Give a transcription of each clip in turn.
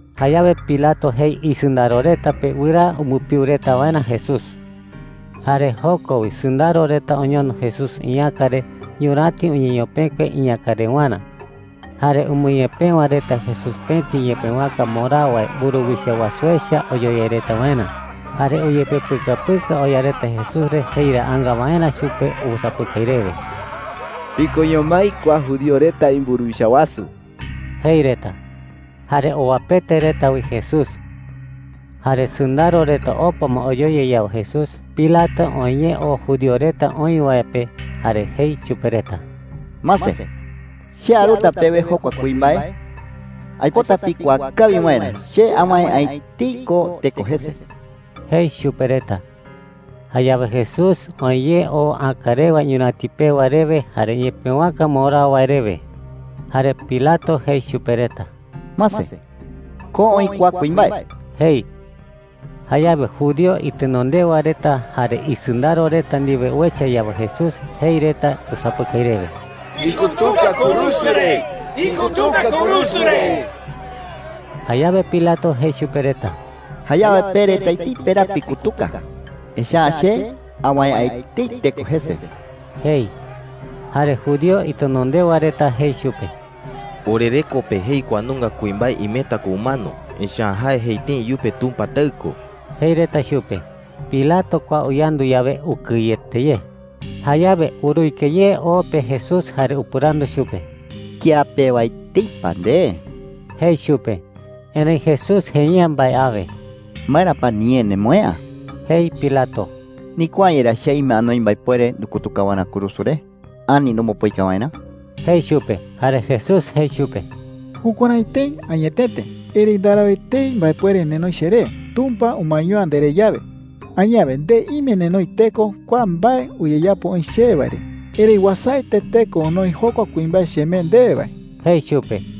Jayawe Pilato jei isɨndaro reta pe wɨraa umbɨpiu reta waerä Jesús. Jare joko wi sɨndaro reta oñono Jesús iñäka re ñuräti uñeñopekue iñäkarewarä. Jare umɨñepëwa reta Jesús pëti ñepëwaka mborao wae mburuwicha wasu echa oyoyai reta waerä. Jare uyepepɨkapɨka oya reta Jesús re jeiraanga waerä chupe usapɨkai rewe: “¡Tikoño mái kua judío reta imburuwicha wasu!” jei reta. Jare owapete reta wi Jesús. Jare sɨndaro reta opa ma oyoyai yawe Jesús, Pilato oë ye oo Judío reta oï wae pe jare jei chupe reta: “Mase, che aruta pewe jokua kuimbae. Aipota pikuaa kawi waerä che awäe’ä etei ko teko jese,” jei chupe reta. Jayawe Jesús oë ye oo äkarewa ñuräti pewa rewe jare ñepëwaka mborao wae rewe. Jare Pilato jei chupe reta: “Mase, ko oï kua kuimbae,” jei. Jayawe judío itenondewa reta jare isɨndaro reta ndiwe uecha yawe Jesús, jei reta usapɨkai rewe: “¡Ikutuka kurusu re! ¡Ikutuka kurusu re!” Jayawe Pilato jei chupe reta: “Jayawe pe reta etei peraa pikutuka. Echa’ä che awäe’ä etei teko jese,” jei. Jare judío itenondewa reta jei chupe: “Orereko pe jei kua nunga kuimbae imeta ko umano, echa’ä jae jei tëi iyupe Tumpa Taɨ ko,” jei reta chupe. Pilato kua uyandu yawe, ukɨyete ye. Jayawe uruike ye o pe Jesús jare upɨrandu chupe: “¿Kía pewa etei pa nde?” jei chupe. Erëi Jesús jei’ä mbae awe. “¿Maera pa niñee nemoë'ä?” jei Pilato. “¿Ndikuaa’ä yerá che ime anoi mbaepuere ndukutuka waerä kurusu re ani nombopoika waerä?” jei chupe. Jare Jesús jei chupe: “Jukuärái tëi añetete. Erëi ndarau etei mbaepuere nenoi cheré Tumpa umaeño’ä nderé yawe. Añawe nde ime nenoi teko kua mbae uyeyapo oï chewe wae re. Erëi uasaete teko onoi jokua kuimbae chemee ndewe wae,” jei chupe.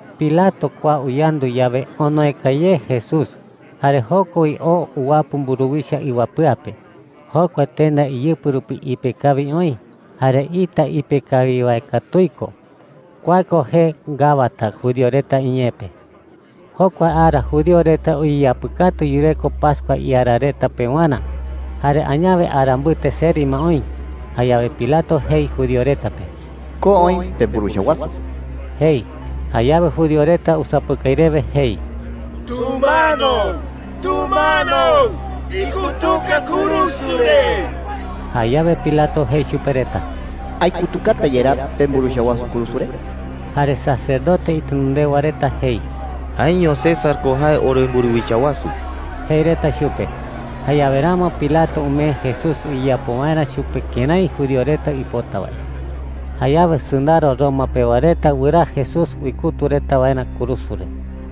Pilato kua uyandu yawe, onoeka ye Jesús. Jare joko wi oo uwapɨ mburuwicha iwapɨa pe. Jokua tenda iyɨpɨ rupi ipe kawi oï, jare ita ipe kawi wae katuii ko. Kua ko jee Gabata judío reta iñee pe. Jokua ara judío reta uyeyapɨkatu yureko pascua iara reta pewarä, jare añawe ara mbɨte seri ma oï. Jayawe Pilato jei judío reta pe: “Ko oï pemburuwicha wasu,” jei. Jayawe judío reta usapɨkai rewe jei: “¡Tumano! ¡Tumano! ¡Ikutuka kurusu re!” Jayawe Pilato jei chupe reta: “¿Aikutukata yerá pemburuwicha wasu kurusu re?” Jare sacerdote itenondewa reta jei: “Jaeño César ko jae oremburuwicha wasu,” jei reta chupe. Jayawe ramo Pilato umee Jesús uyeyapo waerä chupe kërái judío reta uipota wae. Jayawe sɨndaro Roma pewa reta wɨraa Jesús uikutu reta waerä kurusu re.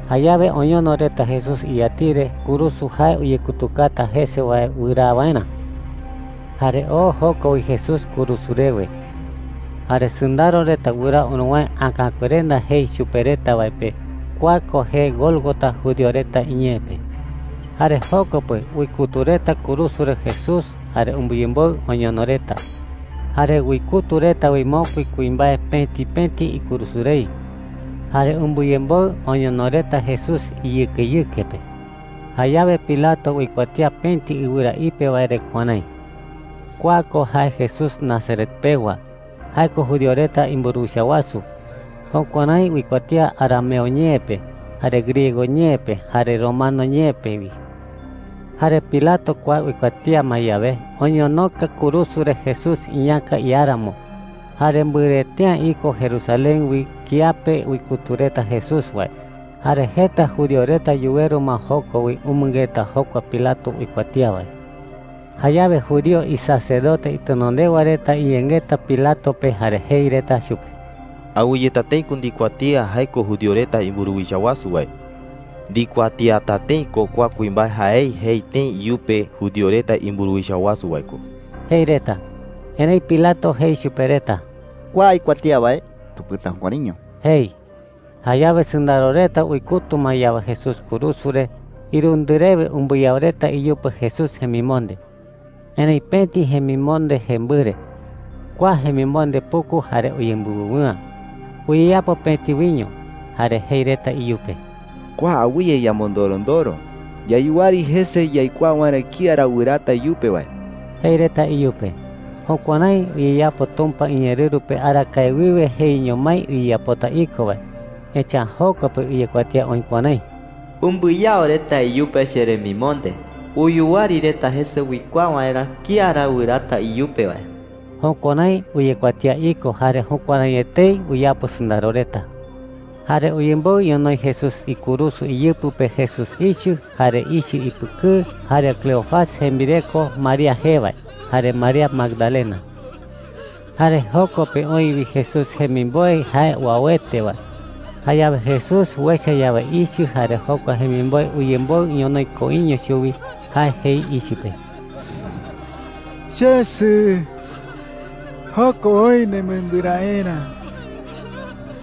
Jayawe oñono reta Jesús iyatiɨ re kurusu jae uyekutukata jese wae wɨraa waerä. Jare oo joko wi Jesús kurusu rewe. Jare sɨndaro reta wɨraa uruwäe Äkakuerenda jei chupe reta wae pe. Kua ko jee Gólgota judío reta iñee pe. Jare joko pe uikutu reta kurusu re Jesús jare umbɨyemboɨ oñono reta. Jare uikutu reta wi mokui kuimbae pëti pëti ikurusu rei, jare umbɨyemboɨ oñono reta Jesús iyɨkeyɨke pe. Jayawe Pilato uikuatía pëti ɨwɨra ipe wae re kuärái: “KUA KO JAE JESÚS NAZARET PEWA. JAE KO JUDÍO RETA IMBURUWICHA WASU.” Jukuärái uikuatía arameo ñee pe, jare griego ñee pe, jare romano ñee pe wi. Jare Pilato kua uikuatía ma yawe, oñonoka kurusu re Jesús iñäka iáramo. Jare mbɨrɨete’ä iko Jerusalén wi kiape uikutu reta Jesús wae. Jare jeta judío reta yuweru ma joko wi umɨngeta jokua Pilato uikuatía wae. Jayawe judío isacerdote itenondewa reta iyengeta Pilato pe jare jei reta chupe: “Awɨyeta tëi ko ndikuatía jae ko judío reta imburuwicha wasu wae. Ndikuatiata tëi ko kua kuimbae jaei jei tëi iyupe judío reta imburuwicha wasu wae ko,” jei reta. Erëi Pilato jei chupe reta: “Kua aikuatía wae, tupɨta jukuäraiño,” jei. Jayawe sɨndaro reta uikutu ma yawe Jesús kurusu re, irundɨ rewe umbɨyao reta iyupe Jesús jemimonde. Erëi pëti jemimonde jembɨre. Kua jemimonde puku jare uyembɨwɨwɨ'ä. Uyeyapo pëti wiño. Jare jei reta iyupe: “Kua awɨye yamondorondoro. Yayuwari jese yaikuaa waerä kía ra wɨraata iyupe wae,” jei reta iyupe. Jukuärái uyeyapo Tumpa iñeerɨru pe arakae wiwe jeiño mái uyeyapota iko wae. Echa’ä joko pe uyekuatía oï kuärái: “Umbɨyao reta iyupe cheremimonde. Uyuwari reta jese uikuaa waerä kía ra wɨraata iyupe wae.” Jukuärái uyekuatía iko jare jukuärái etei uyapo sɨndaro reta. Jare uyemboɨ ñonoï Jesús ikurusu iyɨpɨ pe Jesús ichɨ, jare ichɨ ipɨkɨɨ, jare Cleofas jembireko María jee wae, jare María Magdalena. Jare joko pe oï wi Jesús jemimboe jae uauete wae. Jayawe Jesús uecha yawe ichɨ jare jokua jemimboe uyemboɨ ñonoï koiño chuwi, jae jei ichɨ pe: “Chesɨ, joko oï nemembɨraerä,” jei chupe.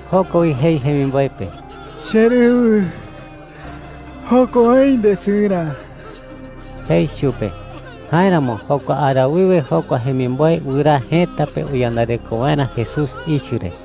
Joko wi jei jemimboe pe: “Cherɨwɨ, joko oï ndesɨrä,” jei chupe. Jáeramo jokua ara wiwe jokua jemimboe wɨraa jëta pe uyandareko waerä Jesús ichɨ re.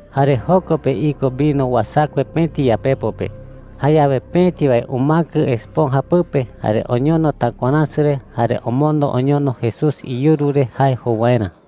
Jare joko pe iko vino uasakue pëti yapepo pe. Jayawe pëti wae umäkɨ esponja pɨpe, jare oñono takuaräsɨ re, jare omondo oñono Jesús iyuru re jae jou waerä.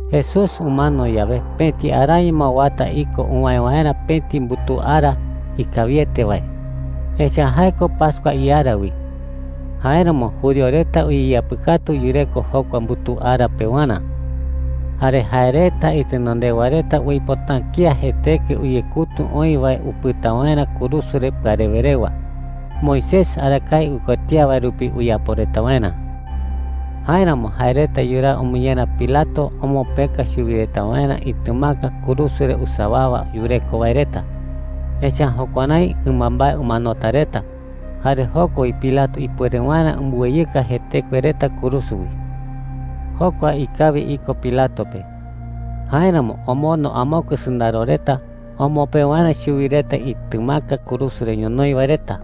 Jesús umano yawe, pëti araño ma uata iko uwäe waerä pëti mbutuu ara ikawiete wae, echa’ä jae ko pascua iara wi. Jáeramo judío reta uyeyapɨkatu yureko jokua mbutuu ara pewarä. Jare jae reta itenondewa reta uipota’ä kía jetekue uyekutu oï wae upɨta waerä kurusu re pɨarewe rewa, Moisés arakae uikuatía wae rupi uyapo reta waerä. Jáeramo jae reta yuraa umɨñera Pilato omopëka chuwi reta waerä itɨmaka kurusu re usawawa yureko wae reta. Echa’ä jukuärái ɨmambae umanota reta, jare joko wi Pilato ipuere waerä umbɨweyɨka jetekue reta kurusu wi. Jokua ikawi iko Pilato pe. Jáeramo omondo amokue sɨndaro reta omopë waerä chuwi reta itɨmaka kurusu re ñonoï wae reta.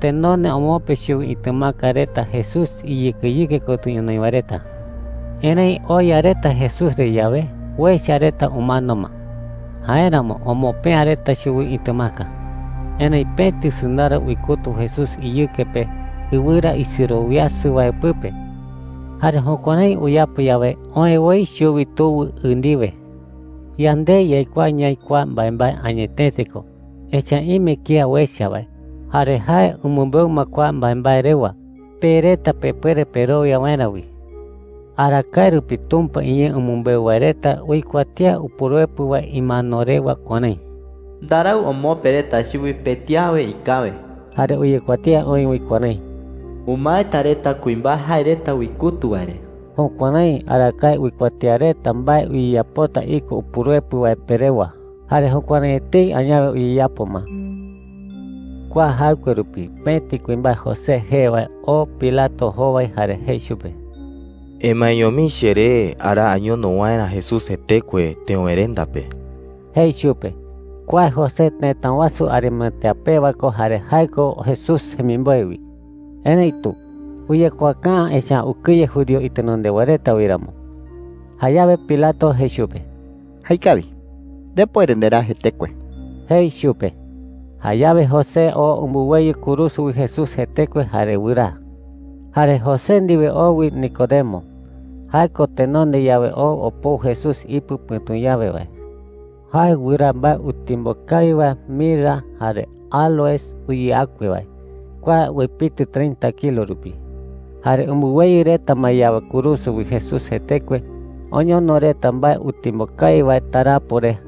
Tenonde omopë chuwi itɨmaka reta Jesús iyɨkeyɨke kotɨ ñonoï wae reta. Erëi oya reta Jesús re yawe, uecha reta umano ma. Jáeramo omopë'ä reta chuwi itɨmaka. Erëi pëti sɨndaro uikutu Jesús iyɨke pe ɨwɨra isirowiasɨ wae pɨpe. Jare jukuärái uyapo yawe, oë woi chuwi tuwɨ ɨ ndiwe. Yande yaikuaa ñaï kua mbaembae añetete ko, echa’ä ime kía uecha wae. Jare jae umɨmbeu ma kua mbaembae rewa, pe reta pepuere perowia waerä wi. Arakae rupi Tumpa iñee umɨmbeu wae reta uikuatía Upuruepɨ wae imano rewa kuärái: “Ndarau omopë reta chuwi pëti awe ikäwe.” Jare uyekuatía oï wi kuärái: “Umaeta reta kuimbae jae reta uikutu wae re.” Jukuärái arakae uikuatía reta mbae uyeyapota iko Upuruepɨ wae pe rewa, jare jukuärái etei añawe uyeyapo ma. Kua jaɨkue rupi pëti kuimbae José jee wae oo Pilato jowai jare jei chupe: “Emaeño mii cheré araa añono waerä Jesús jetekue teöwerenda pe,” jei chupe. Kua José tëta wasu Arimatea pewa ko jare jae ko Jesús jemimboe wi. Erëitu uyekuaaka’ä, echa’ä ukɨye judío itenondewa reta wi ramo. Jayawe Pilato jei chupe: “Jaekawi. Ndepuere nderaa jetekue,” jei chupe. Jayawe José oo umbɨweyɨ kurusu wi Jesús jetekue jare wɨraa. Jare José ndiwe oo wi Nicodemo – jae ko tenonde yawe oo opou Jesús ipɨ pɨ̈tu yawe wae. Jae wɨraa mbae utimbo kawi wae mirra jare áloes uyeakue wae. Kua uepitɨ treinta kilo rupi. Jare umbɨweyɨ reta ma yawe kurusu wi Jesús jetekue, oñono reta mbae utimbo kawi wae tarapo re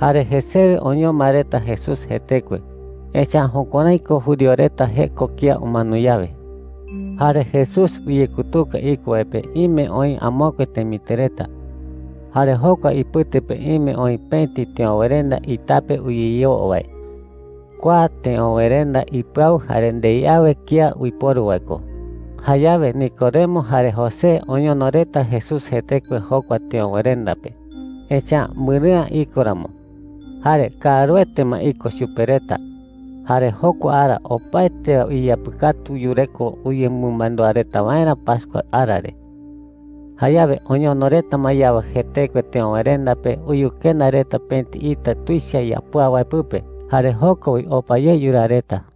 jare jesewe oñoma reta Jesús jetekue. Echa’ä jukuärái ko judío reta jeko kía umano yawe. Jare Jesús uyekutuka iko wae pe ime oï amokue temitɨ reta. Jare jokua ipɨte pe ime oï pëti teöwerenda itape uyeyoo wae. Kua teöwerenda ipɨau jare ndei awe kía uiporu wae ko. Jayawe Nicodemo jare José oñono reta Jesús jetekue jokua teöwerenda pe, echa’ä mbɨrɨ'ä iko ramo. Jare kaaruete ma iko chupe reta, jare jokua ara opaete wae uyeyapɨkatu yureko uyemɨmandúa reta waerä pascua ara re. Jayawe oñono reta ma yawe jetekue teöwerenda pe, uyukenda reta pëti ita tuicha yapúa wae pɨpe. Jare joko wi opa ye yuraa reta.